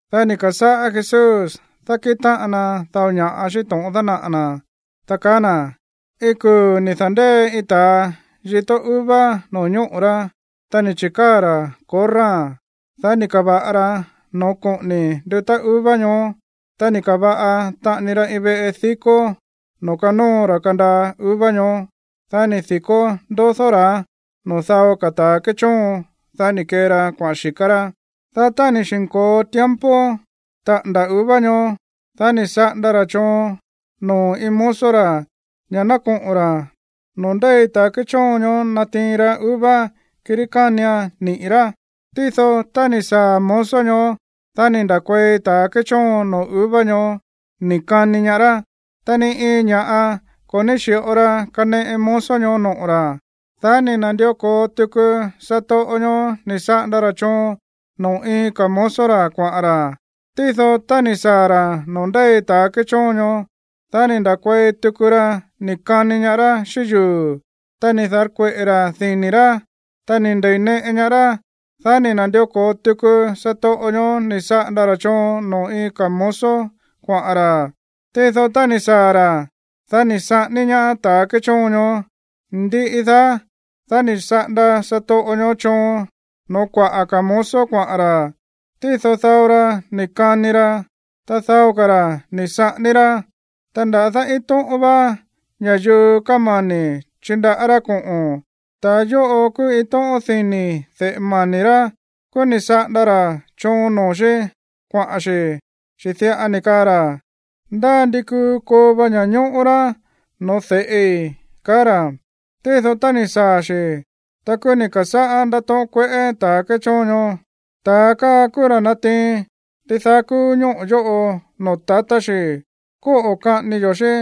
Dá ni̱ ka̱sáꞌá Jesús dákíꞌin táꞌan na dao ña̱ꞌa xíꞌín to̱ꞌon dánaꞌa̱ na̱, ta kaá na̱: ―Iin kuu̱ ni̱ da̱ndée iin ta̱a yitó uva no̱ñóꞌo̱ rá. Ta ni̱ chi̱káa̱ ra̱ korráa̱n. Dá ni̱ ka̱va̱ꞌa ra noo̱ koꞌóní ndúta̱ uva ñoó. Ta ni̱ ka̱va̱ꞌa taꞌani ra iin veꞌe dikó noo̱ kanóo ra̱ kandaa uva ñoó. ’Dá ni̱ di̱kó ndodó ra̱án noo̱ dao ka̱ ta̱a kéchóon. Dá ni̱ kee ra kuaꞌa̱n xíká rá. Dá tá ni̱ xi̱nko̱o tiempo taꞌa̱nda̱ uva ñoó, dá ni̱ saꞌanda ra̱ choon noo̱ iin mozo ra̱ ña̱ ná koꞌo̱n ra̱ noo̱ ndéi ta̱ kéchóon ñoó natiin ra uva, kirí kánian niꞌi̱ rá. Tído tá ni̱ saa̱ mozo ñoó, dá ni̱ nda̱kuei ta̱ kéchóon noo̱ uva ñoó ni̱ kani ñaá rá. Ta ni iin ña̱ꞌa ko̱ ní xi̱ꞌo ra kaneꞌe mozo ñoó noꞌo̱ ra̱. Dá ni̱ na̱ndió ko̱o tuku satoꞌo ñoó ni̱ saꞌanda ra̱ choon noo̱ iin ka̱ mozo ra̱ kuaꞌa̱n ra̱. Tído tá ni̱ saa̱ ra̱ noo̱ ndéi ta̱ kéchóon ñoó, dá ni̱ nda̱kuei tuku ra ni̱ kani ñaá rá xíꞌín yuu̱, ta ni̱ da̱rkueꞌe̱ ra̱ dini̱ rá, ta ni̱ nde̱ineꞌe ñaá rá. Dá ni̱ na̱ndió ko̱o tuku satoꞌo ñoó ni̱ saꞌanda ra̱ choon noo̱ iin ka̱ mozo kuaꞌa̱n ra̱. Tído tá ni̱ saa̱ ra̱, dá ni̱ saꞌání ñaá ta̱ kéchóon ñoó. Ndiꞌi daá, dá ni̱ saꞌanda satoꞌo ñoó choon noo̱ kuaꞌa̱ ka̱ mozo kuaꞌa̱n ra̱. Tído dao ra ni̱ kani ra, ta dao ka̱ ra̱ ni̱ saꞌání rá. ’Ta nda̱dá iin tóꞌón vá ña̱yuu kámani̱ chindaꞌá rá koꞌo̱n. Ta yóꞌo kúú iin tóꞌón dini̱ de̱ꞌe mani̱ rá. Kúú ni̱ saꞌanda ra̱ choon noo̱ xí kuaꞌa̱n xi̱, chi̱ diꞌa ni̱ kaa ra̱: “Ndá ndi kuu koo va ña̱ñóꞌó rá no̱ó de̱ꞌi”, kaá ra̱. Tído tá ni̱ saa̱ xi̱, ta kúú ni̱ ka̱sáꞌá ndátóꞌón kueꞌé ta̱ kéchóon ñoó: “Ta̱a káa kúú ra̱ natiin ndidaá kúú ñóꞌo̱ yóꞌo noo̱ tatá xi̱. Kóꞌo̱ kaꞌání yó xi̱,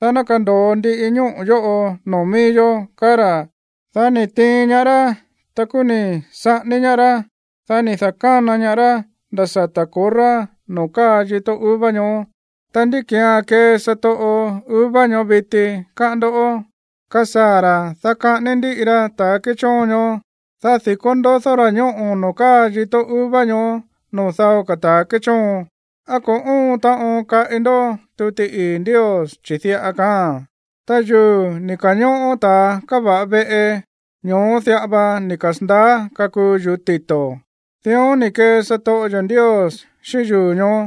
dá ná kando̱o ndiꞌi ñóꞌo̱ yóꞌo noo̱ mií yó”, kaá ra̱. Dá ni̱ tiin ñaá rá. Ta kúú ni̱ saꞌání ñaá rá. Dá ni̱ da̱kána ñaá rá nda̱ sata̱ korrá noo̱ káa yitó uva ñóó. Ta, ¿ndí ki̱án kee satoꞌo uva ñoó viti, káꞌán ndó? Kasaa̱ ra̱, dá kaꞌání ndíꞌi ra ta̱ kéchóon ñoó, dá di̱kó ndodó ra̱ ñóꞌo̱ noo̱ káa yitó uva ñóó noo̱ dao ka̱ ta̱ kéchóon. ’¿Á ko̱ óon taꞌon kaꞌi ndó tuti ii̱ Ndios? Chi̱ diꞌa kaáa̱n: Ta yuu̱ ni̱ ka̱ñóꞌó ta̱ káva̱ꞌa veꞌe, ño̱ó diꞌa va ni̱ kasa̱ndaá kakuu yuu̱ tito̱. Dión ni̱ kee satoꞌo yo̱ Ndios xíꞌín yuu̱ ñoó.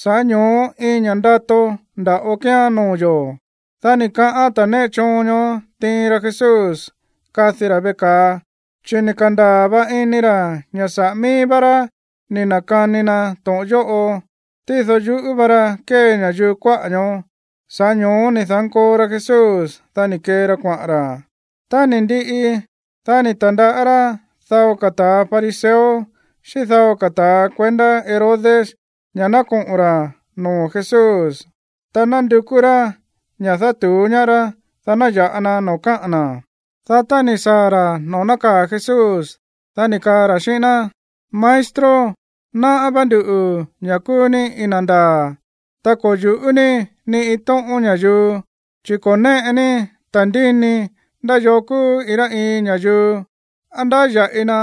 Sa̱ꞌá ño̱ó iin ña̱ꞌa ndato nda̱ꞌo kíán noo̱ yo̱. Dá ni̱ kaꞌán ta̱ néꞌe choon ñoó tiin ra Jesús kadi ra̱ veꞌe ka̱a, chi̱ ni̱ ka̱ndaa̱ va ini ra̱ ña̱ saꞌa̱ mií vá rá ni̱ na̱kani na to̱ꞌon yóꞌo. Tído yuꞌú va ra kée ña̱yuu kuáꞌa̱ ñoó. Sa̱ꞌá ño̱ó ni̱ da̱nkoo ra Jesús, dá ni̱ kee ra kuaꞌa̱n ra̱. Tá ni̱ ndiꞌi, dá ni̱ ta̱ndaꞌá rá dao ka̱ ta̱ fariseo xíꞌín dao ka̱ ta̱ kuendá Herodes ña̱ ná koꞌo̱n ra̱ noo̱ Jesús, ta nandukú rá ña̱ dátu̱ú ñaá rá, dá ná ya̱ꞌa na noo̱ kaꞌa̱n na̱. Dá tá ni̱ saa̱ ra̱ noo̱ nákaa̱ Jesús, dá ni̱ kaa ra̱ xíꞌín ná: ―Maestro, náꞌá vá nduꞌu̱ ña̱ kúú ní iin na̱ ndaa̱. Ta ko̱ yu̱ꞌú ní ni iin tóꞌón ña̱yuu, chi̱ ko̱ néꞌe ní ta̱ndíni ndá yoo kúú iin rá iin ña̱yuu, á ndáya̱ꞌi na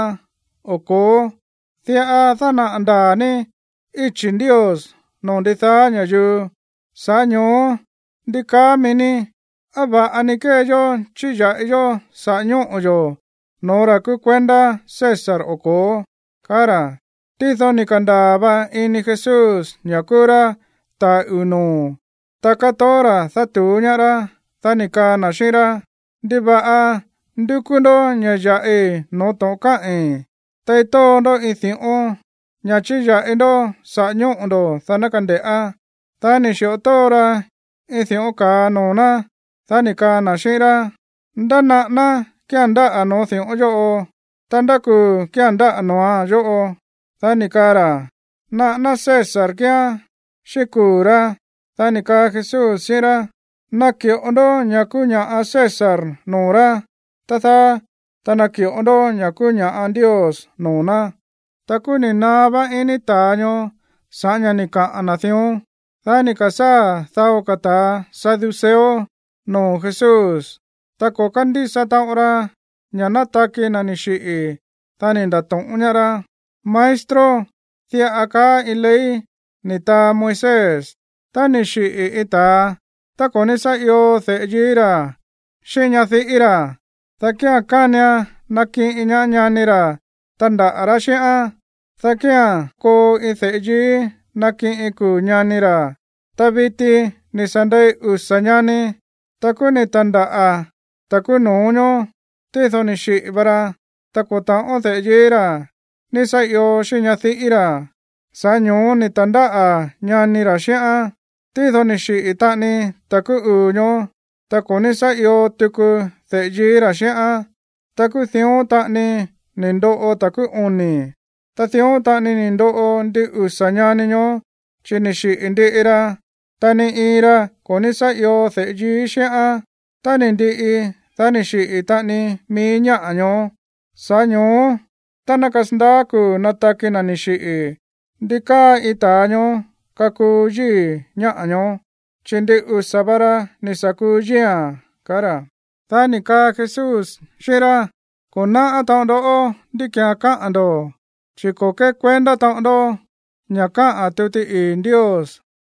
o ko̱ó. Diꞌa dánaꞌa̱ ndaa̱ ní íchi̱ Ndios noo̱ ndidaá ña̱yuu. Sa̱ꞌá ño̱ó, ¿ndi kaá mií ní? ¿Á va̱ꞌa ni kée yó chíya̱ꞌi yó saꞌa̱ ñóꞌo̱ yo̱ no̱ó ra̱ kúú kuendá César o ko̱ó? ―kaá ra̱. Tído ni̱ ka̱ndaa̱ va ini Jesús ña̱ kúú rá ta̱a uu̱ noo̱, ta kátoó ra̱ dátu̱ú ñaá rá. Dá ni̱ kaa na̱ xíꞌín rá: ―¿Ndiva̱ꞌa ndúkú ndó ña̱ ya̱ꞌi no̱ó to̱ꞌon káꞌi̱n? Tei tóo ndó iin di̱ꞌón, ña̱ chíya̱ꞌi ndó saꞌa̱ ñóꞌo̱ ndo̱, dá ná kande̱ꞌá. Dá ni̱ xi̱ꞌo tóo ra iin di̱ꞌón ka̱a noo̱ ná. Dá ni̱ kaa na̱ xíꞌín rá: ―¿Ndá naꞌáná kía̱n ndáꞌa̱ noo̱ di̱ꞌón yóꞌo? Ta, ¿ndá kuu̱ kía̱n ndáꞌa̱ noo̱án yóꞌo? Dá ni̱ kaa ra̱: ―Naꞌáná César kíán xíꞌín kuu̱ rá. Dá ni̱ kaa Jesús xíꞌín rá: ―Naki̱ꞌo ndó ña̱ kúú ña̱ꞌa César noo̱ rá, tá dáá, ta naki̱ꞌo ndó ña̱ kúú ña̱ꞌa Ndios noo̱ ná. Ta kúú ni̱ naá vá ini ta̱a ñoó sa̱ꞌá ña̱ ni̱ kaꞌa̱n na̱ dión. Dá ni̱ ka̱sáa̱ dao ta̱ saduceo noo̱ Jesús. Ta ko̱ kándísa taꞌon ra ña̱ nataki na̱ ni̱ xiꞌi̱. Dá ni̱ nda̱to̱ꞌón ñaá rá: ―Maestro, diꞌa kaá iin ley ni̱ taa Moisés: “Tá ni̱ xiꞌi̱ iin ta̱a, ta ko̱ ní sá io de̱ꞌe yií ra̱ xíꞌín ñadiꞌí ra̱, dá kía̱n kánian nakiꞌin ñaá ñani ra̱ tandaꞌa̱ rá xíꞌán, dá kía̱n koo iin de̱ꞌe yií nakiꞌin kuu̱ ñani ra̱.” Ta viti, ni̱ sa̱ ndei usa̱ ñani. Ta kúú ni̱ ta̱ndáꞌa̱ ta̱ kúú no̱ó ñoó, tído ni̱ xiꞌi̱ va ra, ta ko̱ ta̱ꞌón de̱ꞌe yií ra̱ ní sá io xíꞌín ñadiꞌí ra̱. Sa̱ꞌá ño̱ó ni̱ ta̱ndáꞌa̱ ñani ra̱ xíꞌán. Tído ni̱ xiꞌi̱ taꞌani ta̱ kúú uu̱ ñoó, ta ko̱ ní sá io tuku de̱ꞌe yií ra̱ xíꞌán. Ta kúú dión taꞌani ni̱ ndoꞌo ta̱ kúú oni̱. Ta dión taꞌani ni̱ ndoꞌo ndin usa̱ ñani ñoó, chi̱ ni̱ xiꞌi̱ ndiꞌi ra, ta ni iin ra ko̱ ní sá io de̱ꞌe yií xíꞌán. Tá ni̱ ndiꞌi, dá ni̱ xiꞌi̱ taꞌani mií ñáꞌa̱ ñoó. Sa̱ꞌá ño̱ó, tá ná kasandaá kuu̱ nataki na̱ ni̱ xiꞌi̱, ¿ndi káa iin ta̱a ñoó kakuu yíi̱ ñáꞌa̱ ñoó, chi̱ ndin usa̱ va ra ni̱ sa̱ kuu yíi̱a̱n? ―kaá ra̱. Dá ni̱ kaa Jesús xíꞌín rá: ―Ko̱ náꞌá taꞌon ndó ndí ki̱án káꞌa̱n ndo̱, chi̱ ko̱ kékuendá taꞌon ndó ña̱ káꞌa̱n tuti ii̱ Ndios,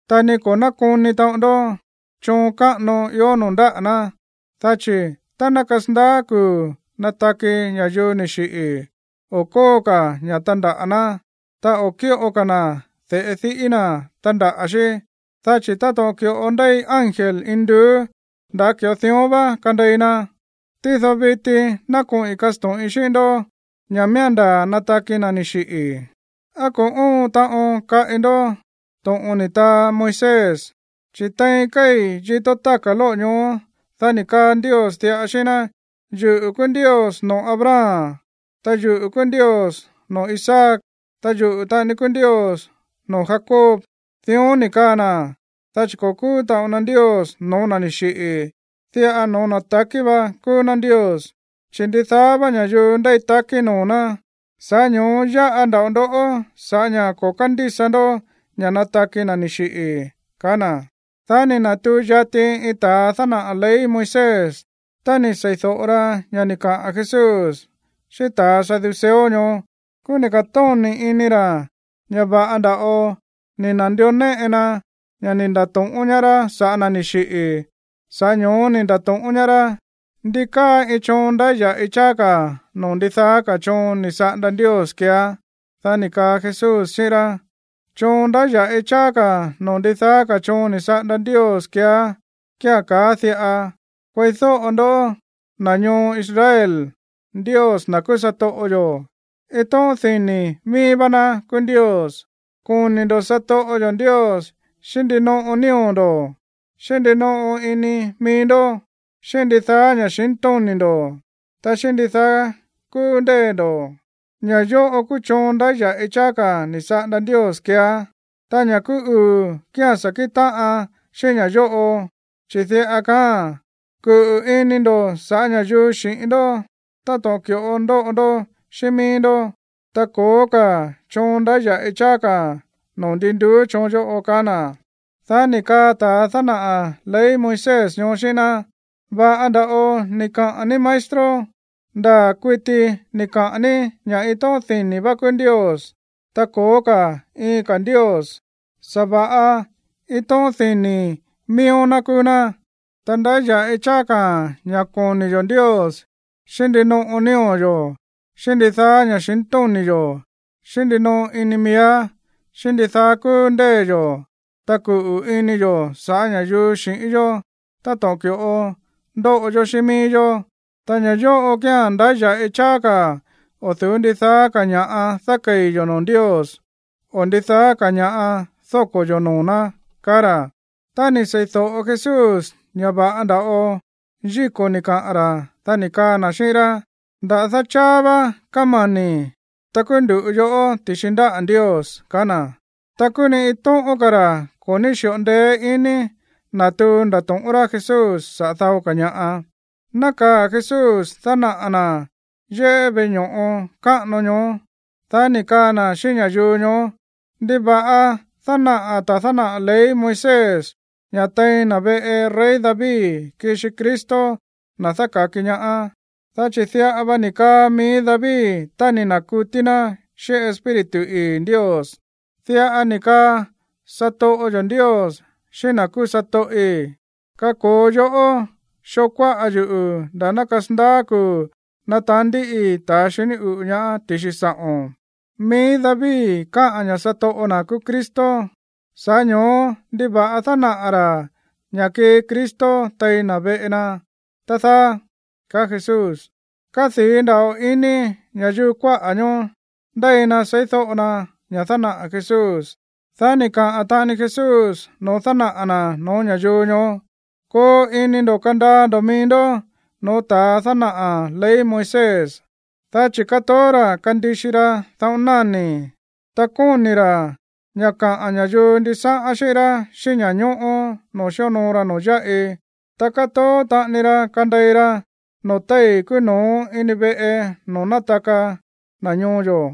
ta ni ko̱ nákoni taꞌon ndó choon káꞌano ió noo̱ ndáꞌa̱ ná. Dá chi̱ tá ná kasandaá kuu̱ nataki ña̱yuu ni̱ xiꞌi̱, o̱ kóo ka̱ ña̱ tandaꞌa̱ ná, ta o̱ kíꞌo ka̱ na̱ de̱ꞌe diꞌí na̱ tandaꞌa̱ xí, dá chi̱ táto̱ꞌon ki̱ꞌo ndéi ángel induú, nda̱ ki̱ꞌo dión vá kandei na. Tído viti ná koꞌi̱n kasto̱ꞌin xíꞌín ndó ña̱ miía̱n ndaa̱ nataki na̱ ni̱ xiꞌi̱. ¿Á ko̱ óon taꞌon kaꞌi ndó to̱ꞌon ni̱ taa Moisés? Chi̱ tein kéi̱ yitó táka̱ lóꞌo̱ ñoó, dá ni̱ kaa Ndios diꞌa xíꞌín ná: “Yuꞌu̱ kúú Ndios noo̱ Abraham, ta yuꞌu̱ kúú Ndios noo̱ Isaac, ta yuꞌu̱ taꞌani kúú Ndios noo̱ Jacob.” Dión ni̱ kaa na̱, dá chi̱ ko̱ kúú taꞌon na Ndios no̱ó na̱ ni̱ xiꞌi̱, diꞌa no̱ó na̱ takí vá kúú ná Ndios, chi̱ ndidaá vá ña̱yuu ndéi takí noo̱ ná. Sa̱ꞌá ño̱ó yáꞌa nda̱ꞌo ndoꞌó sa̱ꞌá ña̱ ko̱ kándísa ndó ña̱ nataki na̱ ni̱ xiꞌi̱ ―kaá na̱. Dá ni̱ na̱tuu yati iin ta̱a dánaꞌa̱ ley Moisés, ta ni̱ sei̱do̱ꞌo ra ña̱ ni̱ kaꞌa̱n Jesús xíꞌín ta̱ saduceo ñoó. Kúú ni̱ ka̱tóni̱ ini ra̱ ña̱ va̱ꞌa nda̱ꞌo ni̱ na̱ndió néꞌe na ña̱ ni̱ nda̱to̱ꞌón ñaá rá sa̱ꞌá na̱ ni̱ xiꞌi̱. Sa̱ꞌá ño̱ó ni̱ nda̱to̱ꞌón ñaá rá: ―¿Ndi káa iin choon ndáya̱ꞌi cháá ka̱ noo̱ ndidaá ka̱ choon ni̱ saꞌanda Ndios keeá? Dá ni̱ kaa Jesús xíꞌín rá: ―Choon ndáya̱ꞌi cháá ka̱ noo̱ ndidaá ka̱ choon ni̱ saꞌanda Ndios keeá kía̱n kaáa̱n diꞌa: “Kueídóꞌo ndoꞌó, na̱ ñoo Israel. Ndios, na̱ kúú satoꞌo yo̱, iin tóꞌón dini̱ mií vá ná kúú Ndios. Koni̱ ndo̱ satoꞌo yo̱ Ndios xíꞌín ndinoꞌo nío̱ ndo̱, xíꞌín ndinoꞌo ini mií ndó, xíꞌín ndidaá ña̱xintóni̱ ndo̱, ta xíꞌín ndidaá kúú ndée̱ ndo̱.” Ña̱ yóꞌo kúú choon ndáya̱ꞌi cháá ka̱ ni̱ saꞌanda Ndios keeá. Ta ña̱ kúú uu̱ kía̱n sá kíꞌin táꞌan xíꞌín ña̱ yóꞌo, chi̱ diꞌa kaáa̱n: “Kuꞌu̱ ini ndo̱ sa̱ꞌá ña̱yuu xi̱ꞌín ndó táto̱ꞌon ki̱ꞌo ndóꞌo ndó xíꞌín mií ndó.” Ta ko̱ó ka̱ choon ndáya̱ꞌi cháá ka̱ noo̱ ndin nduú choon yóꞌo ―kaá na̱. Dá ni̱ kaa ta̱a dánaꞌa̱ ley Moisés ñoó xíꞌín ná: ―Va̱ꞌa nda̱ꞌo ni̱ kaꞌa̱n ní, maestro. Ndaa̱ kuití ni̱ kaꞌa̱n ní ña̱ iin tóꞌón dini̱ vá kúú Ndios. Ta ko̱ó ka̱ iin ka̱ Ndios, sa̱va̱ꞌa iin tóꞌón dini̱ miíó ná kúú ná. Ta ndáya̱ꞌi cháá ka̱ ña̱ koni̱ yo̱ Ndios xíꞌín ndinoꞌo nío̱ yo̱, xíꞌín ndidaá ña̱xintóni̱ yo̱, xíꞌín ndinoꞌo ini miíá, xíꞌín ndidaá kúú ndée̱ yo̱, ta kuꞌu̱ ini yo̱ sa̱ꞌá ña̱yuu xi̱ꞌín yó táto̱ꞌon ki̱ꞌo ndóꞌo yó xíꞌín mií yó. Ta ña̱ yóꞌo kía̱n ndáya̱ꞌi cháá ka̱ o̱ du̱ú ndidaá ka̱ ña̱ꞌa dákei̱ yo̱ noo̱ Ndios, o ndidaá ka̱ ña̱ꞌa dóko̱ yo̱ noo̱ ná ―ka̱á ra̱. Tá ni̱ seídóꞌo Jesús ña̱ va̱ꞌa nda̱ꞌo yíko̱ ni̱ kaꞌa̱n ra̱, dá ni̱ kaa na̱ xíꞌín rá: ―Nda̱dá cháá vá kámani̱, ta kuu ndu̱ꞌu yoꞌó ti̱xi ndáꞌa̱ Ndios ―kaá na̱. Ta kúú ni iin tóꞌón ka̱ ra̱ ko̱ ní xi̱ꞌo ndeé iní natuu ndato̱ꞌón rá Jesús saꞌa̱ dao ka̱ ña̱ꞌa. Nákaa̱ Jesús dánaꞌa̱ na̱ yéꞌé veꞌe ño̱ꞌo káꞌano ñoó, dá ni̱ kaa na̱ xíꞌín ña̱yuu ñoó: ―¿Ndiva̱ꞌa dánaꞌa̱ ta̱a dánaꞌa̱ ley Moisés ña̱ tein na̱ veꞌe rey David kixi Cristo, na̱ dáka̱ki ñaá? Chi̱ diꞌa va ni̱ kaa mií David tá ni̱ na̱kutí ná xíꞌín Espíritu ii̱ Ndios: Diꞌa ni̱ kaa satoꞌo yo̱ Ndios xíꞌín na̱ kúú satoꞌi̱: “Kako̱o yoꞌó xoo kuáꞌa yuꞌu̱ nda̱á ná kasandaá kuu̱ nataán ndíꞌii ta̱ xiní uꞌu̱ ñaá ti̱xi sa̱ꞌo̱n.” Mií David kaá ña̱ satoꞌo na̱ kúú Cristo, sa̱ꞌá ño̱ó, ¿ndiva̱ꞌa dánaꞌa̱ ra̱ ña̱ kii Cristo tein na̱ veꞌe na, tá dáá? ―kaá Jesús. Kádii̱ nda̱ꞌo ini ña̱yuu kuáꞌa̱ ñoó ndéi na seídóꞌo na ña̱ dánaꞌa̱ Jesús. Dá ni̱ kaa taꞌani Jesús noo̱ dánaꞌa̱ na̱ no̱ó ña̱yuu ñoó: ―Koo ini ndo̱ kandaa ndo̱ mií ndó no̱ó ta̱a dánaꞌa̱ ley Moisés, dá chi̱ kátoó ra̱ kandixi ra daꞌón náni̱, ta kóni̱ ra̱ ña̱ kaꞌa̱n ña̱yuu ndisáꞌán xíꞌín rá xíꞌín ña̱ñóꞌó noo̱ xíonoo ra noo̱ yáꞌi. Ta kátoó taꞌani ra kandei ra noo̱ téi̱ kúú no̱ó ini veꞌe noo̱ nátaka na̱ ñoo yo̱,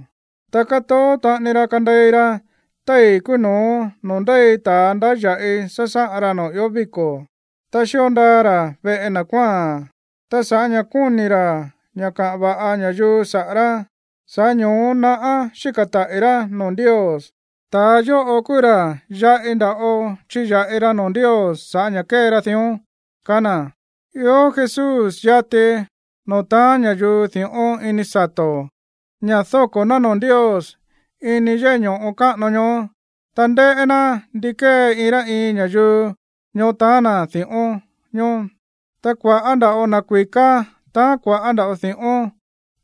ta kátoó taꞌani ra kandei ra téi̱ kúú no̱ó noo̱ ndéi ta̱ ndáya̱ꞌi sásáꞌan ra noo̱ ió víko̱. Ta xío ndaa ra̱ veꞌe na̱ kuáa̱n. Ta sa̱ꞌá ña̱ kóni̱ ra̱ ña̱ kaꞌa̱n va̱ꞌa ña̱yuu saꞌa̱ rá, sa̱ꞌá ño̱ó naꞌá xíka̱ taꞌi̱ rá noo̱ Ndios. Ta̱ yóꞌo kúú ra̱ yaꞌi nda̱ꞌo chiya̱ꞌi ra noo̱ Ndios sa̱ꞌá ña̱ kée ra dión ―kaá na̱. Ió Jesús yati noo̱ taán ña̱yuu di̱ꞌón ini sato̱, ña̱ dóko̱ ná noo̱ Ndios ini yéꞌé ño̱ꞌo káꞌano ñoó, ta ndéꞌé ná ndi kée iin rá iin ña̱yuu ñoó taán na̱ di̱ꞌón ñoó. Ta kua̱ꞌá nda̱ꞌo na̱ kui̱ká taán kua̱ꞌá nda̱ꞌo di̱ꞌón.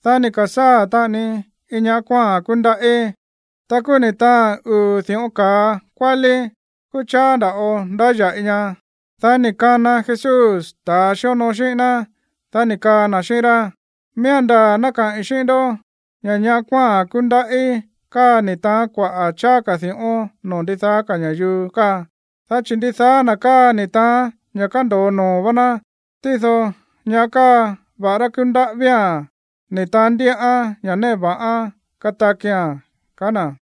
Dá ni̱ ka̱sáa̱ taꞌani iin ñaꞌá kuáa̱n kúndaꞌí. Ta kúú ni̱ taáán uu̱ di̱ꞌón ka̱a kuálí. Kúú cháá nda̱ꞌo ndáya̱ꞌi ña. Dá ni̱ kana Jesús ta̱ xíonoo xíꞌín ná, dá ni̱ kaa na̱ xíꞌín rá: ―Miía̱n ndaa̱ ná kaꞌi̱n xíꞌín ndó ña̱ ñaꞌá kuáa̱n kúndaꞌí káa ni̱ taán kuaꞌa̱ cháá ka̱ di̱ꞌón noo̱ ndidaá ka̱ ña̱yuu káa, dá chi̱ ndidaá na̱ káa ni̱ taán ña̱ kándo̱o noo̱ vá ná. Tído ñáꞌa̱ káa, va̱ꞌará kúndaꞌí vía̱n, ni̱ taán ndíꞌán ña̱ néꞌe va̱ꞌán katakia̱n ―ka̱á na̱.